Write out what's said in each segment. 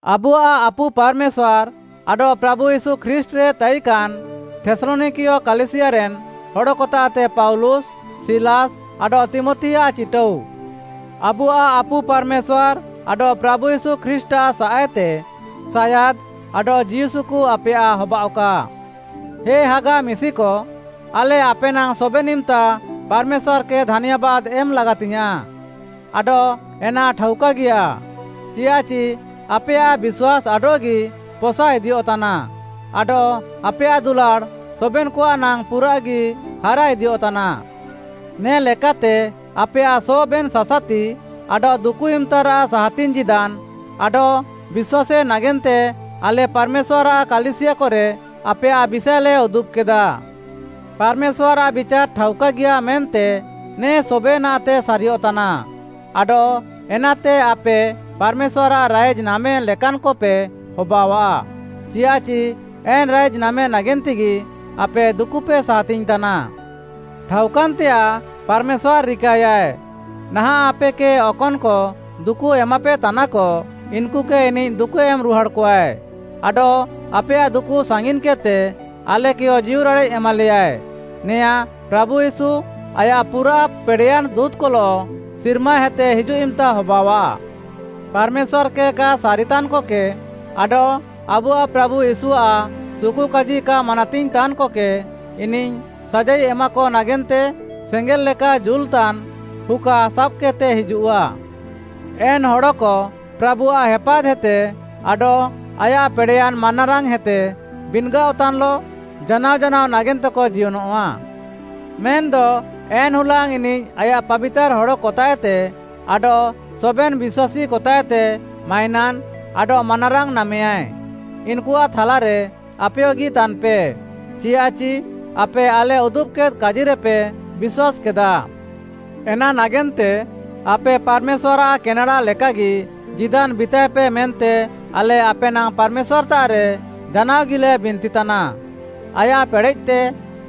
ଆବୁଆଃ ଆପୁ ପାର୍‌ମେଶ୍ୱାର୍‌ ଆଡଃ ପ୍ରାଭୁ ୟୀଶୁ ଖ୍ରୀଷ୍ଟ୍‌ରେ ତାଇକାନ୍‌ ଥେସ୍‌ଲନିକା କାଲିସିୟାରେନ୍‌ ହଡ଼କତାଃତେ ପାଉଲୁସ୍‌, ସିଲାସ୍‌ ଆଡଃ ତୀମଥିଆଃ ଚିଟାଉ। ଆବୁଆଃ ଆପୁ ପାର୍‌ମେଶ୍ୱାର୍‌ ଆଡଃ ପ୍ରାଭୁ ୟୀଶୁ ଖ୍ରୀଷ୍ଟ୍‌ଆଃ ସାଃଏତେ ସାୟାଦ୍‍ ଆଡଃ ଜୀଉସୁକୁ ଆପେୟାଃ ହବାଅଃକା। ହେ ହାଗା ମିଶିକ, ଆଲେ ଆପେ ନାଙ୍ଗ୍‌ ସବେନ୍‌ ଇମ୍‌ତା ପାର୍‌ମେଶ୍ୱାର୍‌କେ ଧାନ୍ୟାବାଦ୍‌ ଏମ୍‌ ଲାଗାତିଙ୍ଗ୍‌ୟାଁଃ, ଆଡଃ ଏନା ଠାଉକାଗିୟା, ଚିୟାଃଚି ଆପେୟାଃ ବିଶ୍ୱାସ୍‌ ଆଡଃଗି ପସା ଇଦିୟଃତାନା, ଆଡଃ ଆପେୟାଃ ଦୁଲାଡ଼୍‌ ସବେନ୍‌କଆଃ ନାଙ୍ଗ୍‌ ପୁରାଃଗି ହାରା ଇଦିୟଃତାନା। ନେ ଲେକାତେ ଆପେୟାଃ ସବେନ୍‌ ସାସାତି ଆଡଃ ଦୁକୁ ଇମ୍‌ତାରାଃ ସାହାତିଙ୍ଗ୍‌ ଜୀଦାନ୍‌ ଆଡଃ ବିଶ୍ୱାସ୍‌ ନାଗେନ୍ତେ ଆଲେ ପାର୍‌ମେଶ୍ୱାର୍‌ଆଃ କାଲିସିୟାକରେ ଆପେୟାଃ ବିଷାଏଲେ ଉଦୁବ୍‌କେଦା। ପାର୍‌ମେଶ୍ୱାର୍‌ଆଃ ବିଚାର୍‌ ଠାଉକାଗିୟା, ମେନ୍ତେ ନେ ସବେନାଃତେ ସାରିୟଃତାନା ଆଡଃ ଏନାତେ ଆପେ ପାର୍‌ମେଶ୍ୱାର୍‌ଆଃ ରାଇଜ୍‌ ନାମେ ଲେକାନ୍‌କପେ ହବାଅଆଃ, ଚିୟାଃଚି ଏନ୍‌ ରାଇଜ୍‌ ନାମେ ନାଗେନ୍ତେଗି ଆପେ ଦୁକୁପେ ସାହାତିଙ୍ଗ୍‌ତାନା। ଠାଉକାନ୍‌ତେୟାଃ ପାର୍‌ମେଶ୍ୱାର୍‌ ରିକାୟାଏ, ନାହାଁଃ ଆପେକେ ଅକନ୍‌କ ଦୁକୁ ଏମାପେତାନାକ, ଇନ୍‌କୁକେ ଇନିଃ ଦୁକୁ ଏମ୍‌ ରୁହାଡ଼୍‌କଆଏ, ଆଡଃ ଆପେୟାଃ ଦୁକୁ ସାଙ୍ଗିନ୍‌କେଦ୍‌ତେ, ଆଲେକେୟ ଜୀଉରାଡ଼େଃ ଏମାଲେୟାଏ। ନେଆଁଁ ପ୍ରାଭୁ ୟୀଶୁ, ଆୟାଃ ପୁରାଃ ପେଡ଼େୟାନ୍‌ ଦୁଁତ୍‌କଲଃ ସିର୍ମାହେତେ ହିଜୁଃ ଇମ୍‌ତା ହବାଅଃଆ। ପାର୍‌ମେଶ୍ୱାର୍‌କେ କା ସାରିତାନ୍‌କକେ, ଆଡଃ ଆବୁଆଃ ପ୍ରାଭୁ ୟୀଶୁଆଃ ସୁକୁକାଜି କା ମାନାତିଙ୍ଗ୍‌ ତାନ୍‌କକେ ଇନିଃ ସାଜାଇ ଏମାକ ନାଗେନ୍ତେ ସେଙ୍ଗେଲ୍‌ ଲେକା ଜୁଲ୍‌ତାନ୍‌ ହୁକା ସାବ୍‌କେଦ୍‌ତେ ହିଜୁଃଆ। ଏନ୍‌ ହଡ଼କ ପ୍ରାଭୁଆଃ ହେପାଦ୍‌ହେତେ ଆଡଃ ଆୟାଃ ପେଡ଼େୟାନ୍‌ ମାନାରାଙ୍ଗ୍‌ହେତେ ବିନ୍‌ଗାଅଃତାନ୍‌ଲଃ ଜାନାଅ ଜାନାଅ ନାଗେନ୍ତେକ ଜିୟନଃଆ। ମେନ୍‌ଦ ଏନ୍‌ ହୁଲାଙ୍ଗ୍‌ ଇନିଃ ଆୟାଃ ପାବିତାର୍‌ ହଡ଼କତାଃଏତେ ଆଡଃ ସବେନ୍‌ ବିଶ୍ୱାସୀକତାଃଏତେ ମାଇନାନ୍‌ ଆଡଃ ମାନାରାଙ୍ଗ୍‌ ନାମେୟାଏ। ଇନ୍‌କୁଆଃ ଥାଲାରେ ଆପେୟଗି ତାନ୍‌ପେ, ଚିୟାଃଚି ଆପେ, ଆଲେ ଉଦୁବ୍‌କେଦ୍‌ କାଜିରେପେ ବିଶ୍ୱାସ୍‌କେଦା। ଏନା ନାଗେନ୍ତେ ଆପେ ପାର୍‌ମେଶ୍ୱାର୍‌ଆଃ କେନେଡ଼ା ଲେକାଗି ଜୀଦାନ୍‌ ବିତାଏପେ ମେନ୍ତେ ଆଲେ ଆପେ ନାଙ୍ଗ୍‌ ପାର୍‌ମେଶ୍ୱାର୍‌ତାଃରେ ଜାନାଅଗିଲେ ବିନ୍ତିତାନା। ଆୟାଃ ପେଡ଼େଃତେ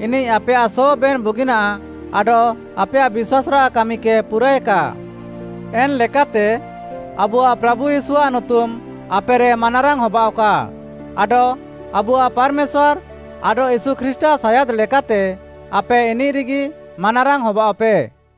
ଇନିଃ ଆପେୟାଃ ସବେନ୍‌ ବୁଗିନାଃ ଆଡଃ ଆପେୟାଃ ବିଶ୍ୱାସ୍‌ରାଃ କାମିକେ ପୁରାଏକା। ଏନ୍‌ଲେକାତେ ଆବୁଆଃ ପ୍ରାଭୁ ୟୀଶୁଆଃ ନୁତୁମ୍‌ ଆପେରେ ମାନାରାଙ୍ଗ୍‌ ହବାଅଃକା, ଆଡଃ ଆବୁଆଃ ପାର୍‌ମେଶ୍ୱାର୍‌ ଆଡଃ ୟୀଶୁ ଖ୍ରୀଷ୍ଟ୍‌ଆଃ ସାୟାଦ୍‍ ଲେକାତେ ଆପେ ଇନିଃରେଗି ମାନାରାଙ୍ଗ୍‌ ହବାଅଃପେ।